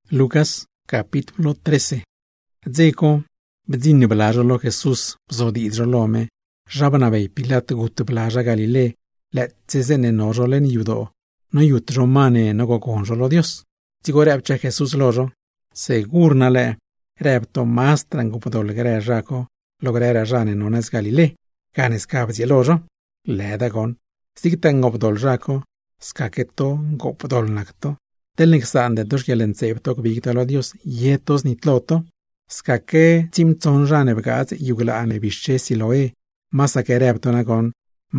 Leṉ dze co, bdziṉ bla zho lo Jesús bzodiidz zho lo me zha bnabey Pilat gut bla zha Galilé, lëëtse zeeṉe no zho leṉ yadoo noyut zho ma ne nogogon zho lo Dios. Dzigo rëbchaa Jesús lo zho: ―Segur na lëë, rëb to mazdraa ngoopdoḻ grë zha co lo grëraa zha ne no nëz Galilé, gane sca bdzieelo zho. ¡Lëda goṉ! Zigtaa ngoopdoḻ zha co, scaque to ngoopdoḻ nac to; teḻne csaande to xquieḻntseeb to gbig to lo Dios, ye to znitlo to. Scaque tsiimtsoṉ zha ne bgaadz yuglaa ne bixche Siloé, masaque rëb to nagoṉ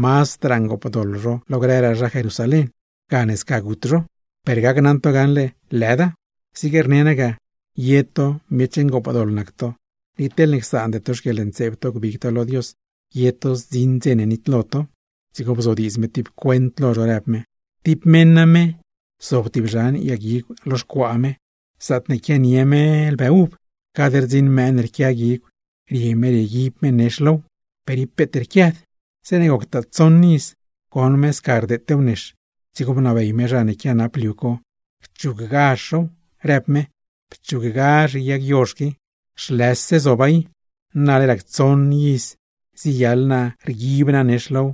mazdraa ngoopdoḻ zho lo grëraa zha Jerusalén, gane sca gut zho. Per gacnaṉ to gaṉle, ¡lëda! ¡Zig rne naa ga, ye to miech ngoopdoḻ nac to, ni teḻne csaande to xquieḻntseeb to gbig to lo Dios, ye to zdziṉ dze ne nitlo to! Dzigo bzodiidz me tib cuent lo zho, rëb me: ―Tib meṉ name, zob tib zhan yag guigw lo xcuaa me zaatne quianie me lbë uv. Cad rdziṉ mëë ne rquia guigw, rie me rieguib me nex low, per ib peet rquiad. Zeeṉe goctaa tsoṉ iz, goṉ me sca rdeetew nex, dzigo bnabey me zha ne quianap liu co cchuggazh zhow, rëb me: “¡Pchuggazh yag yozh qui, zhlëse zoba i! Nale rac tsoṉ iz ziyaḻ naa rguib naa nex low,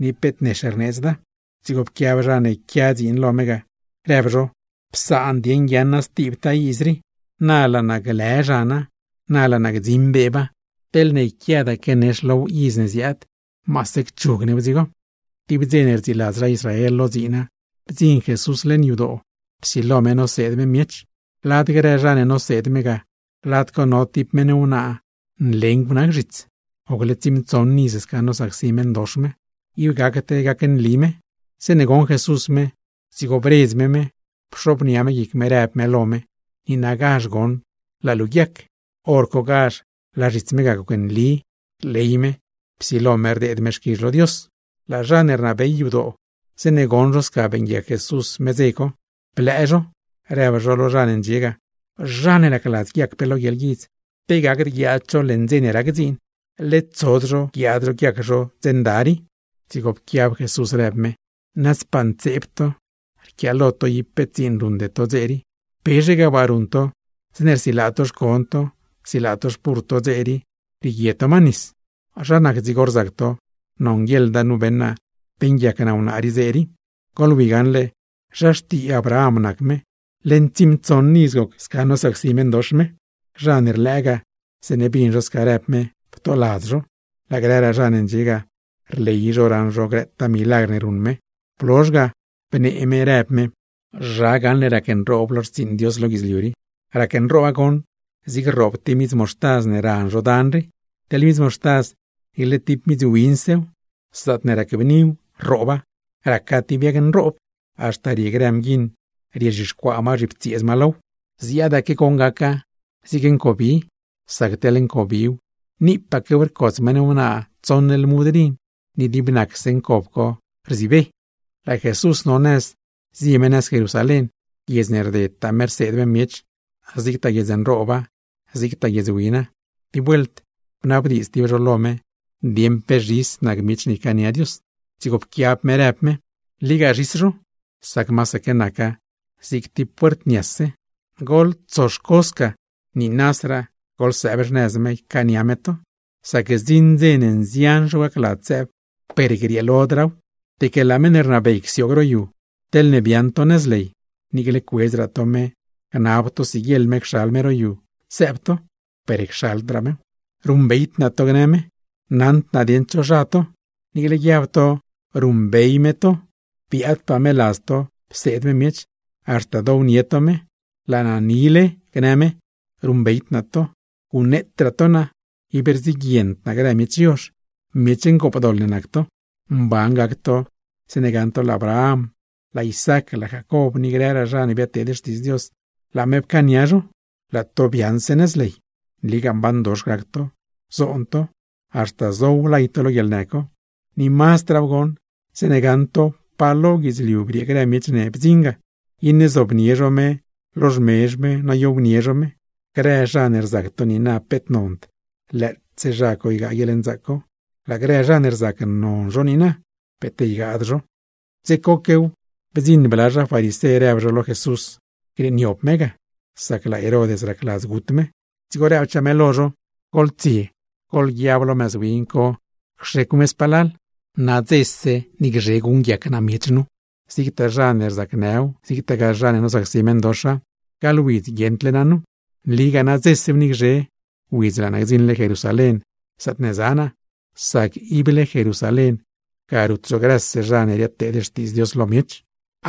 ni peet nex rneedzda.” Dzigo pquiab zha ne quia dziin lo me ga, rëb zho: “Psaan dieṉ guiaaṉa stibtaa iz rii, na laa naa glë zhana, na laa naa gdziṉ beeba. Teḻne yquiadaque nex low iz ne ziaad, maase cchug new dzigo.” Tib dze ne rdziiladz zha Israel lo dziina, bdziṉ Jesús leṉ yadoo, psilo me noseed me miech. Lad grë zha ne noseed me ga, lad co no tib meṉ wnaa nlengw nac zhits, gocle tsiimtsoṉ iz sca nosacsi meṉdox me, ib gacd gacnli me. Zeeṉe goṉ Jesús me, dzigo bredz me me, pxobnia me guic me, rëb me lo me: ―¡Niinagazh goṉ, laa luu guiac! ¡Horcogazh laa zhits me ga gocnli, rley me, psilo me rdeed me xquizh lo Dios! Laa zha ne rnabey yadoo, zeeṉe goṉ zho sca beeṉguiac Jesús me dze co, blëë zho, rëb zho lo zha ne ndxie ga: ―Zha ne racladz guiac pe lo guieḻguidz, pe gacd guiaad zho leṉ dze ne rac dziin, ¡led tsod zho guiaad zho guiac zho dze nda rii! Dzigo pquiab Jesús rëb me: ―¡Nazdpaa ntseeb to! Rquiaalo to ib peet dziin ruṉde to dze rii. ¿Pezhe ga waa ruṉ to zeeṉe rsilaa to xcon to, rsilaa to xpurr to dze rii rieguie to ma nis? Zha nac dzigo rzac to, nonguieḻda nu beṉ naa beeṉguiac naa wnaa rii, dze rii. Goḻwi gaṉle zha xtii Abraham nac me, leṉ tsiimtsoṉ iz goc sca nosacsi meṉdox me. Zha ne rlëë ga, zeeṉe bin zho sca rëb me, ptoladz zho; laa grëraa zha ne ndxie ga, rley zho raṉ zho grëtaa milagr ne ruṉ me. Blozh ga, bnee me rëb me: ―¿Zha gaṉle racnroob lo xtsiiṉ Dios lo guidzliu rii? Racnrooba goṉ zig rroob tib midz moxtaz ne ran zho dan rii. Teḻ midz moxtaza niicle tib midz winsew, zaatne racbniw, rrooba, raca tib yag nroob; haxta rie grë mguiṉ riezhixcuaa ma zhiptsieez ma low. ’Ziaadaque goṉ gaca, zig ncobi. Sac teḻ ncobiw, niipaquew rcots meṉ wnaa tsoṉ lmud rin, ni dib nacse ncob co rzibe. Laa Jesús no nëz zie me nëz Jerusalén. Guiedz ne rdedtaa me rseed me miech; zigtaa guiedz nrooba, zigtaa guiedz wina. Tib vuelt bnabdiidz tib zho lo me, dieṉ pe zhis nac miech ne ycaania Dios. Dzigo pquiab me rëb me: ―Nligaa zhis zho, sac masaque naca zig tib puert niase. Goḻtsoxco sca niinasraa goḻsëëb xnëz me ycaania me to, sac zdziṉ dze ne nzian zho gacladz sëëb, per grieelodraaw. Deque laa meṉ ne rnabey csioog ro yu, teḻne biaaṉ to nëz ley, niicle cuedzraa to me gnab to siguieḻ me cxal me ro yu sëëb to, per cxaldraa mew. “Ruṉbeyd naa to”, gnë me, “naṉd naa dieṉ cho zha to.” Niicle guiab to ruṉbey me to, biaadpaa me ladz to pseed me miech, haxta downie to me. “Laa naa nile”, gnë me, “ruṉbeyd naa to. ¡Guṉneetraa to naa, ib rdziguiend naa grë miech yozh, miech ngoopdoḻ ne nac to!” ’Mban gac to zeeṉe gaṉ to laa Abraham, laa Isaac, laa Jacob ni grëraa zha ne biadteed xtiidz Dios, laa me pcaania zho, laa to biaaṉse nëz ley. Nligaa mbandox gac to, zoon to, haxta zow lay to lo guieḻnë co. Ni mazdraaw goṉ, zeeṉe gaṉ to pa lo guidzliu briee grë miech ne bdziṉ ga, iṉe zobnie me zho lo xmezh me noyownie me zho. Grë zha ne rzac to niina peet nond, lëëtse zha co ygaa guieḻnzaac co; laa grë zha ne rzac non zho niina, peet ygad zho. Dze coquew, bdziṉ bla zha farisé rëb zho lo Jesús grieeniob me ga, sac laa Herod racladz gut me. Dzigo rëbchaa me lo zho: ―Goḻtsie goḻguiab lo mëz win co cxecw me spalal, nadzese ni gzhe guṉguiac naa miech nu, zigtaa zha ne rzacnëw, zigtagaa zha ne nosacsi meṉdoxa; gaḻ widz guieṉdle naa nu. ¡Nligaa nadzesew ni gzhe, widz laa naa gdziṉle Jerusalén zaatne za naa! Sac ible Jerusalén, ga rut zho grëse zha ne riadteed xtiidz Dios lo miech.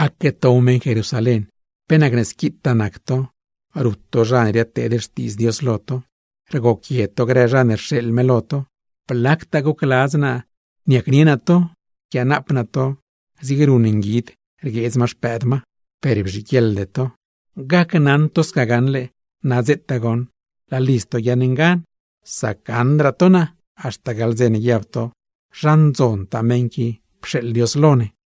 ’¡Aque tow meṉ Jerusalén! ¿Pe nacne squitaa nac to, rut to zha ne ziadteed xtiidz Dios lo to, rgoquie to grë zha ne rxeeḻ me lo to? Blactaa gocladz naa niacnie naa to, nquianaap naa to zig ruṉ nguid rgueedz ma xpëëd ma, per bzhiguieḻde to. Gacnaṉ to gaṉle, nadzetaa goṉ laa lidz to guiaaṉ ngan, sac gaṉdraa to naa, haxta gaḻ dze ne guiab to: “¡Zha ndzontaa meṉ qui pxeeḻ Dios lo ne!”